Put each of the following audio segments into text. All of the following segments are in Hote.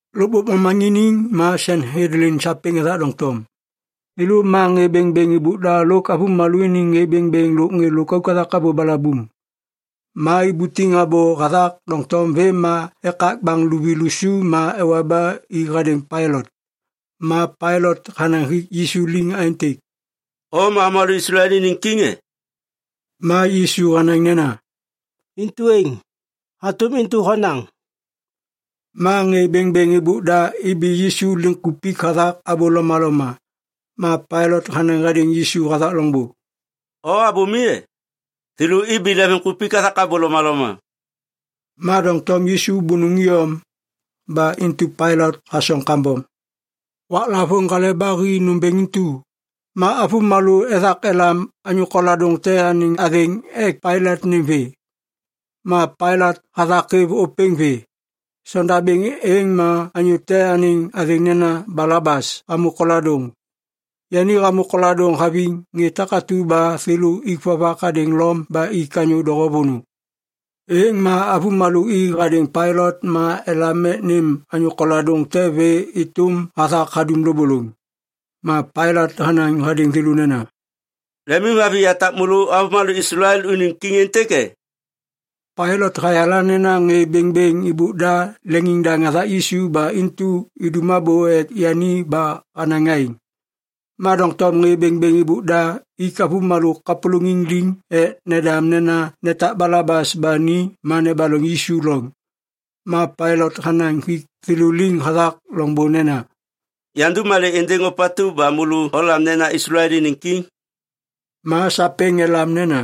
Lôkbôk momaŋiniŋ ma Sanhedlin sapêŋ ethak doŋtom. Thêlô ma ŋê bêŋbêŋ êbôk da lôk avômalô iniŋ ŋê bêŋbêŋ lôk ŋê lôkauk hathak abô balabuŋ. Ma ibutiŋ abô hathak doŋtom vêm ma ekak baŋ luvi lusu ma ewa ba i hadêŋ Pailat. Ma Pailat hanaŋ hik Yisu liŋ aêntêk, “O ma avômalô Islael iniŋ kiŋ e?” Ma Yisu hanaŋ nena, “Intu êŋ, hatôm intu honaŋ.” Ma ŋê bêŋbêŋ êbôk da ibi Yisu liŋkupik hathak abô lomaloma. Ma Pailat hanaŋ hadêŋ Yisu hathak loŋbô, “O abô mi e? Thêlô ibi lemvimkupik hathak abô lomaloma.” Ma doŋtom Yisu bônôŋ iyom. Ba intu Pailat hasoŋ kambom. Waklavôŋ Hale ba Hi nômbêŋ intu, ma avômalô ethak elam anyô koladôŋ te anêŋ athêŋ ek Pailat nêm vê. Ma Pailat hathak hêv ôpêŋ vê. Sondabêŋ êŋ ma anyô te anêŋ athêŋ nena Balabas hamô koladôŋ. Yani hamô koladôŋ haviŋ ŋê takatu ba thêlô ik vovak hadêŋ Lom ba ik anyô doho vônô. Êŋ ma avômalô i hadêŋ Pailat ma elam ek nêm anyô koladôŋ te vê êtôm hathak hadum lôbôlôŋ. Ma Pailat hanaŋ hadêŋ thêlô nena, “Lemimhaviŋ yatak môlô avômalô Islael unim kiŋ êntêk e?” Pailat hayala nena ŋê bêŋbêŋ êbôk da leŋiŋdaŋ hathak Yisu ba intu idum abô ek yani ba hanaŋ aêŋ. Ma doŋtom ŋê bêŋbêŋ êbôk da ik avômalô kapôlôŋiŋ liŋ ek nendam nena netak Balabas ba ni ma nebaloŋ Yisu loŋ. Ma Pailat hanaŋ hik thêlô liŋ hathak loŋbô nena, “Yandum malê êndêŋ ôpatu ba môlô olam nena Islael iniŋ kiŋ?” Ma sapêŋ elam nena,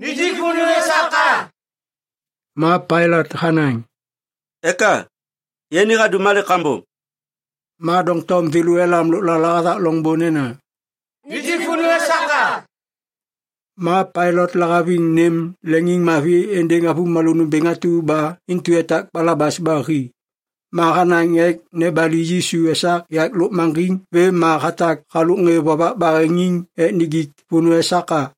“Nijik vônô esak a!” Ma Pailat hanaŋ, “Eka? Yani hadum malê kambom?” Ma doŋtom thêlô elam lôklala hathak loŋbô nena, “Nijik vônô esak a!” Ma Pailat lahaviŋ nêm leŋiŋmavi êndêŋ avômalô nômbêŋ atu ba intu hatak Balabas ba hi. Ma hanaŋ ek nebali Yisu esak yak lôkmaŋgiŋ vêm ma hatak halôk ŋê vovak baheŋiŋ ek nijik vônô esak a.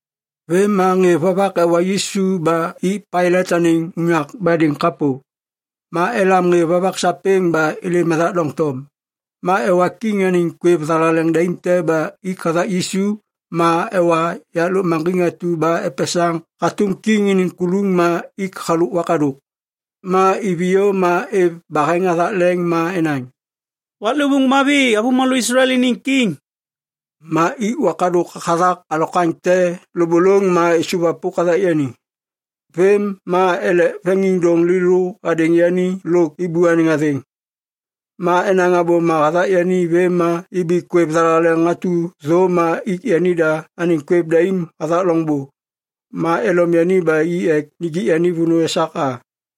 Vêm ma ŋê vovak ewa Yisu ba i Pailat anêŋ unyak badêŋ kapô. Ma elam ŋê vovak sapêŋ ba êlêm ethak doŋtom. Ma ewa kiŋ anêŋ kwêv thalaleŋ daim te ma ik hathak Yisu ma ewa yak lôkmaŋgiŋ atu ba epesaŋ hatôm kiŋ iniŋ kuluŋ ma ik halôk wakadôk. Ma iviyô ma êv baheŋ hathak leŋ ma enaŋ, “Waklêvôŋ mavi, avômalô Islael iniŋ kiŋ!” Ma ik wakadôk hathak alokwaŋ te lôbôlôŋ ma êsôvwapôk hathak yani. Vêm ma elek veŋiŋdôŋ lêlô hadêŋ yani lôk êbô anêŋ athêŋ. Ma enaŋ abôma hathak yani vêm ma ibi kwêv thalaleŋ atu thô ma ik yanida anêŋ kwêv daim hathak loŋbô. Ma elom yani ba i ek nijik vônô esak a.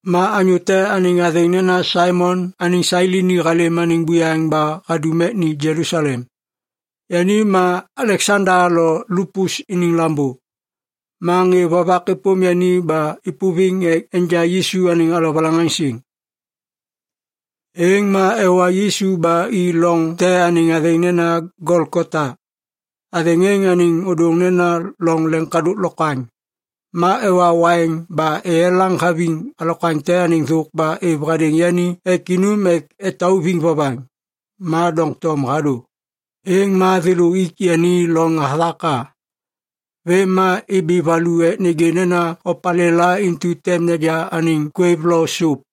Ma anyô te anêŋ athêŋ nena Saimon anêŋ Sailini halêm anêŋ buyaŋ ba hadum ek ni Jelusalem. Yani ma Aleksanda lo Lupus iniŋ lambô. Ma ŋê vovak êpôm yani ba êpôviŋ ek enja Yisu anêŋ alovalaŋaŋsiŋ. Êŋ ma ewa Yisu ba i loŋ te anêŋ athêŋ nena Golgota. Athêŋ êŋ anêŋ ôdôŋ nena Loŋ Leŋkadôk Lokwaŋ. Ma ewa waiŋ ba eyelaŋ haviŋ alokwaŋ te anêŋ thôk ba êv hadêŋ yani ek inum ek etauviŋ vovaŋ. Ma doŋtom hadô. Êŋ ma thêlô ik yani loŋ hathak a. Vêm ma ibi valu ek nêgê nena opalêla intu tem neja anêŋ kwêv lo sôp.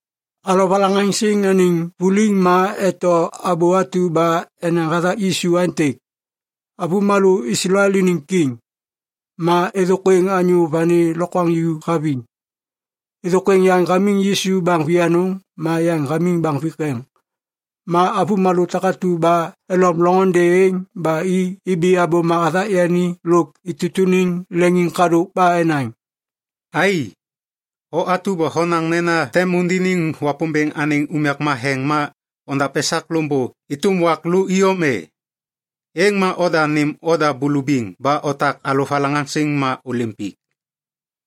Alovalaŋaŋsiŋ anêŋ vuliŋ ma eto abô atu ba enaŋ hathak Yisu aêntêk, AVÔMALÔ ISLAEL INIŊ KIŊ Ma êthôkwêŋ anyô vani lokwaŋju haviŋ. Êthôkwêŋ yaŋ hamiŋ Yisu baŋ vianôŋ, ma yaŋ hamiŋ baŋ vikeŋ. Ma avômalô takatu ba elom loŋôndê êŋ ba i ibi abôma hathak yani lôk itutuniŋ leŋiŋkadôk ba enaŋ, “Ai! O atu ba honaŋ nena tem undiniŋ Wapômbêŋ anêŋ unyak matheŋ ma ondav esak loŋbô êtôm wak lô iyom e? Êŋ ma oda nêm oda bulubiŋ ba otak alovalaŋaŋsiŋ ma ôlêm pik!”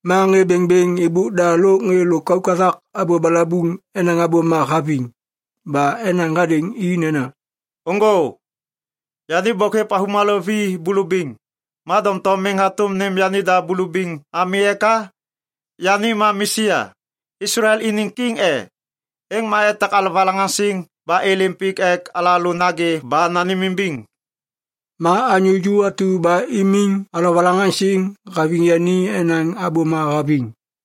Ma ŋê bêŋbêŋ êbôk da lôk ŋê lôkauk hathak abô balabuŋ enaŋ abôma haviŋ. Ba enaŋ hadêŋ i nena, “Ôŋgô! Yani bôk hêv avômalô vi bulubiŋ, ma doŋtom miŋ hatôm nêm yanida bulubiŋ ami eka? Yani ma Mesia, Islael iniŋ kiŋ e? Êŋ ma etak alovalaŋaŋsiŋ ba êlêm pik ek alalô nagê ba nanêmimbiŋ!” Ma anyô ju atu ba imiŋ alovalaŋaŋsiŋ haviŋ yani enaŋ abôma haviŋ.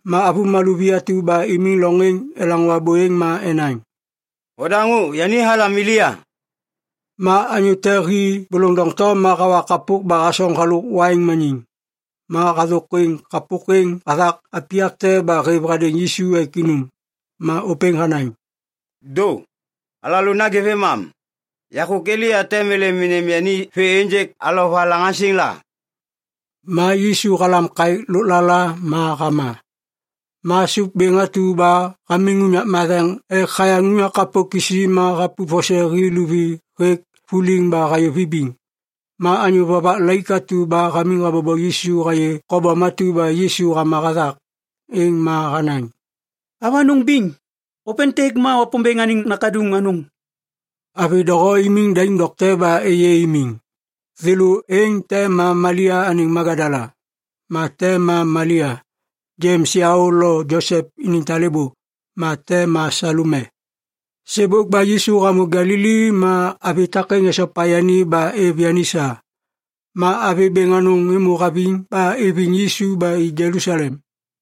Ma avômalô vi atu ba imiŋ loŋ êŋ elaŋô abô êŋ ma enaŋ, “Odaŋô, yani halam Elia.” Ma anyô te hi bôlôŋ doŋtom ma hawa kapôk ba hasoŋ halôk waiŋ maniŋ. Ma hathôkwêŋ kapôk êŋ hathak apiyak te ba hêv hadêŋ Yisu ek inum. Ma ôpêŋ hanaŋ, “Dô! Alalô nagê vêmam. Yakô Elia tem êlêm enja yani vê ênjêk alovalaŋaŋsiŋ la?” Ma Yisu halam kaêk lôklala ma hama. Ma sôp bêŋ atu ba hamiŋ unyak matheŋ ek hayaŋ unyak kapô kisi ma hapup vose hi luvi hêk vuliŋ ba hayô vibiŋ. Ma anyô vovak laik atu ba hamiŋ habobo Yisu hayê kobom atu ba Yisu hama hathak, êŋ ma hanaŋ, “Avanôŋ biŋ, ôpêntêk ma Wapômbêŋ anêŋ Nakaduŋ anôŋ.” Avi doho imiŋ daim dokte ba êyê imiŋ. Thêlô êŋ te ma Malia anêŋ Magadala. Ma te ma Malia, Jems yaô lo Josep iniŋ talêbô. Ma te ma Salome. Sêbôk ba Yisu hamô Galili ma avi takêŋ esopa yani ba êv yani sa. Ma avi bêŋ anôŋ êmô haviŋ ba iviŋ Yisu ba i Jelusalem.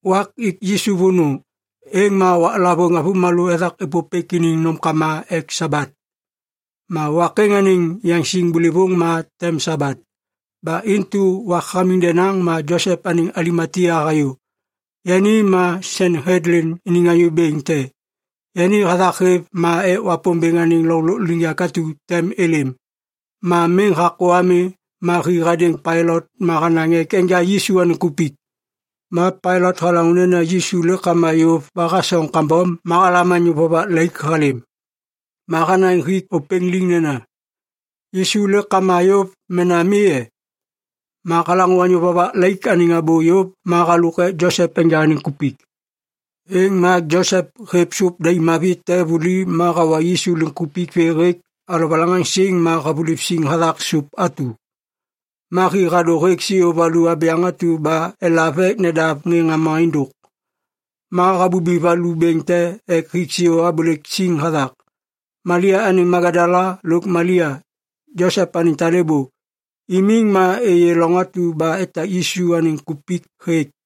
Wak ik Yisu vônô, êŋ ma waklavôŋ avômalô ethak êpôpêk iniŋ nômkama ek Sabat. Ma wak êŋ anêŋ yaŋsiŋ bôlôvôŋ ma tem Sabat. Ba intu wak hamiŋ denaŋ ma Josep anêŋ Alimatia hayô. Yani ma Sanhedlin iniŋ anyô bêŋ te. Yani hathak hêv ma ek Wapômbêŋ anêŋ loŋ lôkliŋyak atu tem êlêm. Ma miŋ hakô ami ma hi hadêŋ Pailat ma hanaŋ ek enja Yisu anêŋ kupik. Ma Pailat halaŋô nena Yisu lêk hama yôv ba hasoŋ kambom ma halam anyô vovak laik halêm. Ma hanaŋ hik ôpêŋ liŋ nena, “Yisu lêk hama yôv mena mi e?” Ma halaŋô anyô vovak laik anêŋ abô yôv ma halôk ek Josep enja anêŋ kupik. Êŋ ma Josep hêv sôp daim mavi te vuli ma hawa Yisu liŋkupik vê hêk alovalaŋaŋsiŋ ma havuliv siŋ hathak sôp atu. Ma hi hadô hêk siô valu abyaŋ atu ba elav ek nedav ŋê ŋama êndôk. Ma habubi valu bêŋ te ek hik siô abôlêk siŋ hathak. Malia anêŋ Magadala lôk Malia, Josep anêŋ talêbô, imiŋ ma êyê loŋ atu ba etak Yisu anêŋ kupik hêk.